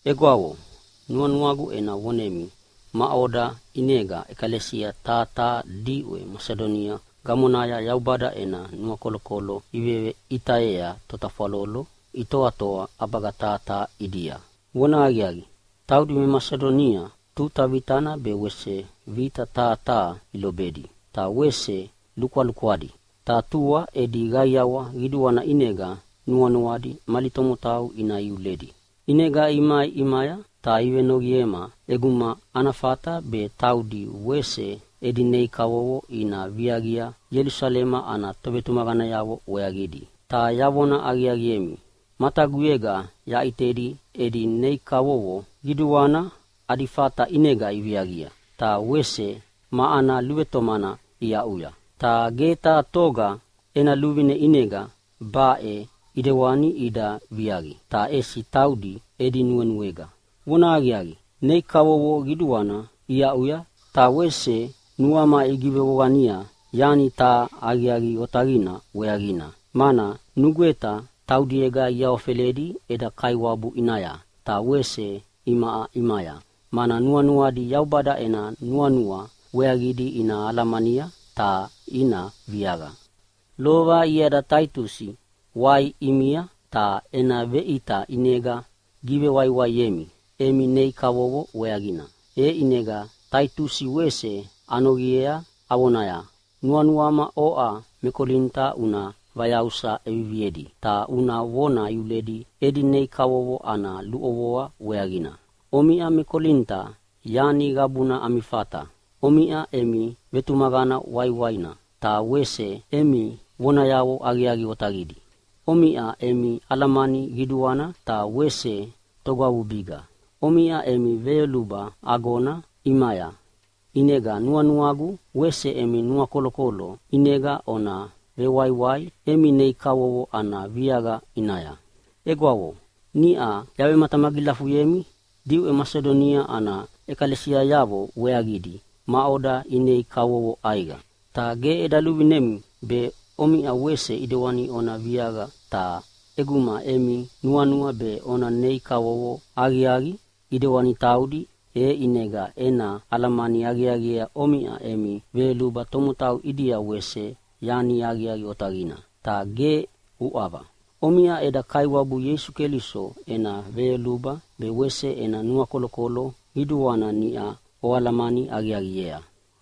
Egwavo, nuanuagu ena vonemi maʼoda ʼinega ʼekalesia taha taha diʼwe Masidonia gamonaya Yaubada ena nuakolokolo iveʼitayea totafwalolo itoatoa ʼabaga taha taha ʼidia. Vonahaqiaqi, taudi me Masidonia tuta vitana be wese vita taha taha ilobedi, ta wese lukwalukwadi, ta tua edi qaiawa qiduana ʼinega nuanuadi mali tomotau ina iuledi. ʼInega imai ʼimaya ta ivenoqiema ʼeguma ana fata be taudi wese edi nei kavovo ina viaqia Ielusalema ana tovetumaqanayavo weaqidi. Ta yavona aqiaqiemi, mataguyega yaʼitedi edi nei kavovo qiduana adi fata ʼinega iviaqia, ta wese ma ana luvetomana iaʼuya. Ta ge taha toga ena luvine ʼinega baʼe ʼidewani ida viaqi, ta ʼesi taudi edi nuenuega. Vonahaqiaqi, nei kavovo qiduana iaʼuya, ta wese nuama igivevoqania yani taha aqiaqi otaqina weaqina, mana nugweta taudiega iawafeledi eda Kaiwabu ʼinaya ta wese imaʼa ʼimaya, mana nuanuadi Yaubada ena nuanua weaqidi ina alamania ta ina viaqia. Lova iada Taitusi wai ʼimia ta ena veʼita ʼinega givewaiwaiemi emi nei kavovo weaqina. E ʼinega Taitusi wese anoqiea avonaya, “Nuanuama oʼa me Kolinita una vayausa ʼeviviedi, ta una vona iuledi edi nei kavovo ana luʼovoa weaqina.” Omiʼa me Kolinita yani qabuna ami fata. Omiʼa emi vetumaqana waiwaina, ta wese emi vonayavo aqiaqi otaqidi. Omiʼa emi alamani qiduana, ta wese togwavubiga. Omiʼa emi veyoluba agona ʼimaya. ʼInega nuanuagu wese emi nuakolokolo ʼinega ona vewaiwai emi nei kavovo ana viaqa ʼinaya. Egwavo, niʼa yavematamagilafuyemi diʼwe Masidonia ana ʼekalesiayavo weaqidi maʼoda inei kavovo ʼaiqa. Ta ge eda luvinemi be omiʼa wese ʼidewani ona viaqia, ta ʼeguma emi nuanua be ona nei kavovo aqiaqi ʼidewani taudi, e ʼinega ena alamani aqiaqiea omiʼa emi veyoluba tomotau ʼidia wese yani aqiaqi otaqina, ta ge uʼava. Omiʼa eda Kaiwabu Ieisu Keliso ena veyoluba be wese ena nuakolokolo qiduana niʼa oalamani aqiaqiea.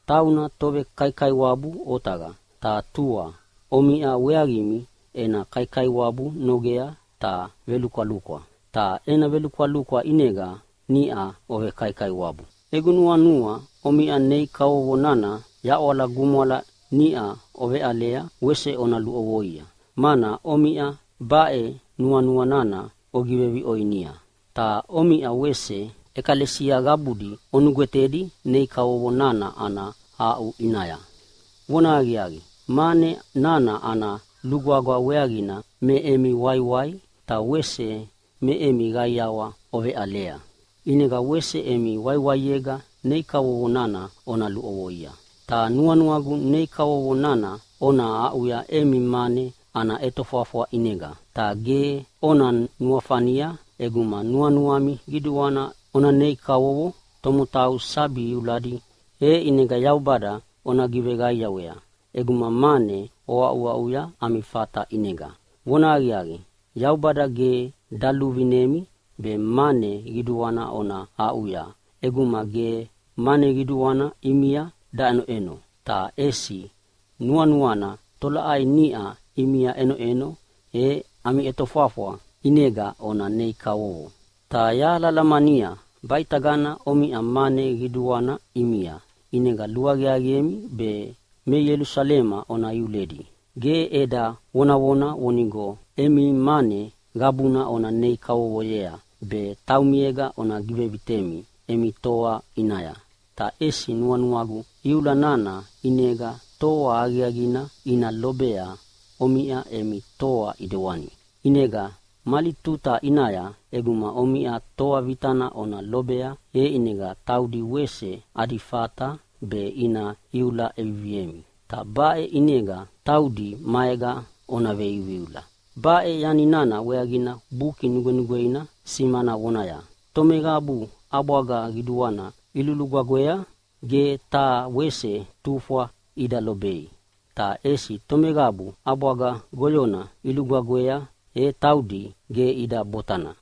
Tauna tovekaikaiwabu otaqa, ta tua omiʼa weaqimi ena kaikaiwabu nogea ta velukwalukwa. Ta ena velukwalukwa ʼinega niʼa ovekaikaiwabu. Egu nuanua omiʼa nei kavovo nana yaʼwala gumwala niʼa oveʼalea e wese ona luʼovoia. Mana omiʼa baʼe nuanua nana ogiveviʼoinia, ta omiʼa wese ʼekalesia qabudi onugwetedi nei kavovo nana ana aʼu ʼinaya. Vonahaqiaqi, mane nana ana lugwagwa weaqina me emi waiwai ta wese me emi qaiawa oveʼalea. ʼInega wese emi waiwaiega nei kavovo nana ona luʼovoia. Ta nuanuagu nei kavovo nana ona aʼuya emi mane ana ʼetofwafwa ʼinega. Ta ge ona nuafania ʼeguma nuanuami qiduana ona nei kavovo tomotau sabi iuladi, e ʼinega Yaubada ona giveqaiawea ʼeguma mane oaʼuaʼuya ami fata ʼinega. Vonahaqiaqi, Yaubada ge daluvinemi be mane qiduana ona aʼuya ʼeguma ge mane qiduana ʼimia daʼenoʼeno, ta ʼesi nuanuana tolaʼai niʼa ʼimia ʼenoʼeno e ami ʼetofwafwa ʼinega ona nei kavovo. Ta yahalahalamania baʼitagana omiʼa mane qiduana ʼimia, ʼinega luaqiaqiemi be me Ielusalema ona iuledi. Ge eda vonavona vonigo emi mane qabuna ona nei kavovoyea be taumiega ona givevitemi emi toa ʼinaya, ta ʼesi nuanuagu iula nana ʼinega toa aqiaqina ina lobea omiʼa emi toa ʼidewani. ʼInega mali tuta ʼinaya ʼeguma omiʼa toa vitana ona lobea, e taudi wese adi fata be ina iula ʼeviviemi. Ta baʼe ʼinega taudi maega ona veiuiula. Baʼe yani nana weaqina Buki Nugwenugweina simana vonaya, “Tomeqabu ʼabwaga qiduana ilugwagwea ge taha wese tufwa ida lobei, ta ʼesi tomeqabu ʼabwaga goyona ilugwagwea, e taudi ge ida botana.”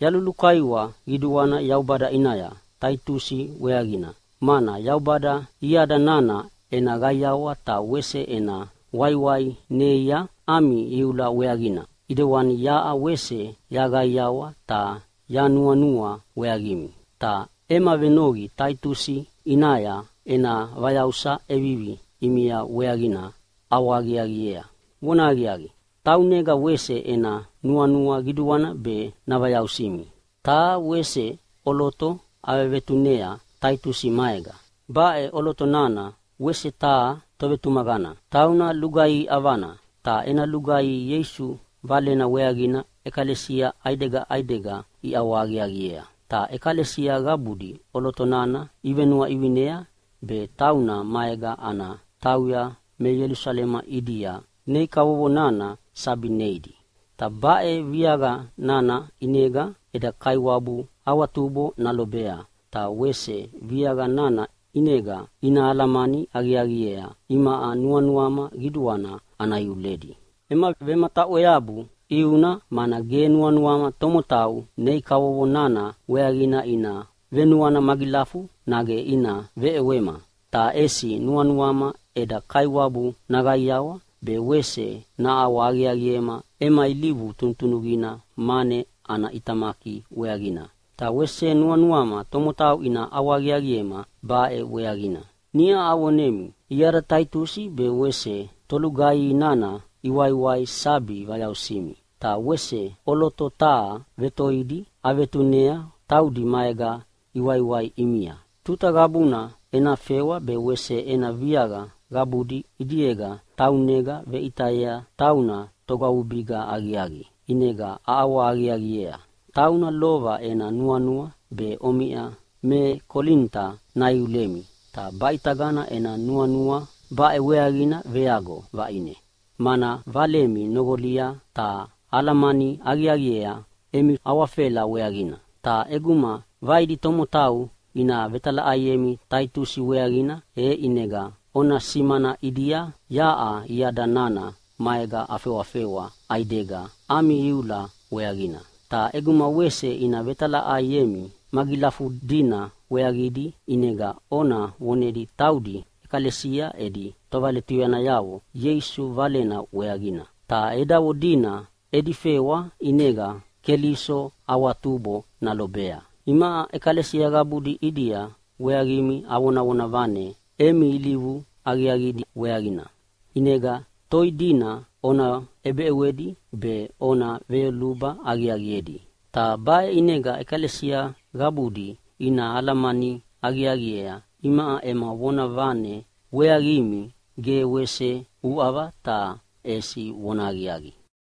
Yalulukaiwa qiduana Yaubada ʼinaya Taitusi weaqina, mana Yaubada iada nana ena qaiawa ta wese ena waiwai neia ami iula weaqina, ʼidewani yaʼa wese yaqaiqaiawa ta yanuanua weaqimi. Ta ema venoqi Taitusi ʼinaya ena vayausa ʼevivi ʼimia weaqina ʼawahaqiaqiea. Vonahaqiaqi, taunega wese ena nuanua qiduana be navayausimi. Taha wese ʼoloto avevetunea Taitusi maega. Baʼe ʼoloto nana wese taha tovetumaqana. Tauna lugaihi ʼavana, ta ena lugaihi Ieisu Valena weaqina ʼekalesia ʼaidega ʼaidega iʼawahaqiaqiea. Ta ʼekalesia qabudi ʼoloto nana ivenuaʼivinea be tauna maega ana tauya me Ielusalema ʼidia nei kavovo nana sabi neidi. Ta baʼe viaqa nana ʼinega eda Kaiwabu awatubo nalobea, ta wese viaqa nana ʼinega ina alamani aqiaqiea imaʼa nuanuama qiduana ana iuledi. Ema vemataʼweabu ʼiuna mana ge nuanuama tomotau nei kavovo nana weaqina ina venuana magilafu nage ina veʼewema. Ta ʼesi nuanuama eda Kaiwabu naqaiawa be wese naʼawahaqiaqiema ema ilivu tunutunuqina mane ana ʼitamaki weaqina, ta wese nuanuama tomotau ina ʼawahaqiaqiema baʼe weaqina. Niʼa avonemi iada Taitusi be wese tolugaihi nana iwaiwai sabi vayausimi. Ta wese ʼoloto taha vetoidi avetunea taudi maega iwaiwai ʼimia. Tuta qabuna ena fewa be wese ena viaqa qabudi ʼidiega taunega veʼitayea tauna togwavubiga aqiaqi, ʼinega aʼawahaqiaqiea. Tauna lova ena nuanua be omiʼa me Kolinita naiulemi, ta baʼitagana ena nuanua baʼe weaqina veago vaʼine, mana valemi noqolia ta alamani aqiaqiea emi awafela weaqina. Ta ʼeguma vaidi tomotau ina vetalaʼaiemi Taitusi weaqina, e ʼinega ona simana ʼidia yaʼa iada nana maega afewafewa ʼaidega ami iula weaqina. Ta ʼeguma wese ina vetalaʼaiemi magilafudina weaqidi, ʼinega ona vonedi taudi ʼekalesia edi tovaletuyanayavo Ieisu Valena weaqina. Ta edavo dina edi fewa ʼinega Keliso awatubo nalobea Imaʼa ʼekalesia qabudi ʼidia weaqimi avonavona vane emi ilivu aqiaqidi weaqina. ʼInega toi dina ona ʼebeʼewedi be ona veyoluba aqiaqiedi. Ta baʼe ʼinega ʼekalesia qabudi ina alamani aqiaqiea imaʼa ema vonavane weaqimi ge wese uʼava, ta ʼesi vonahaqiaqi.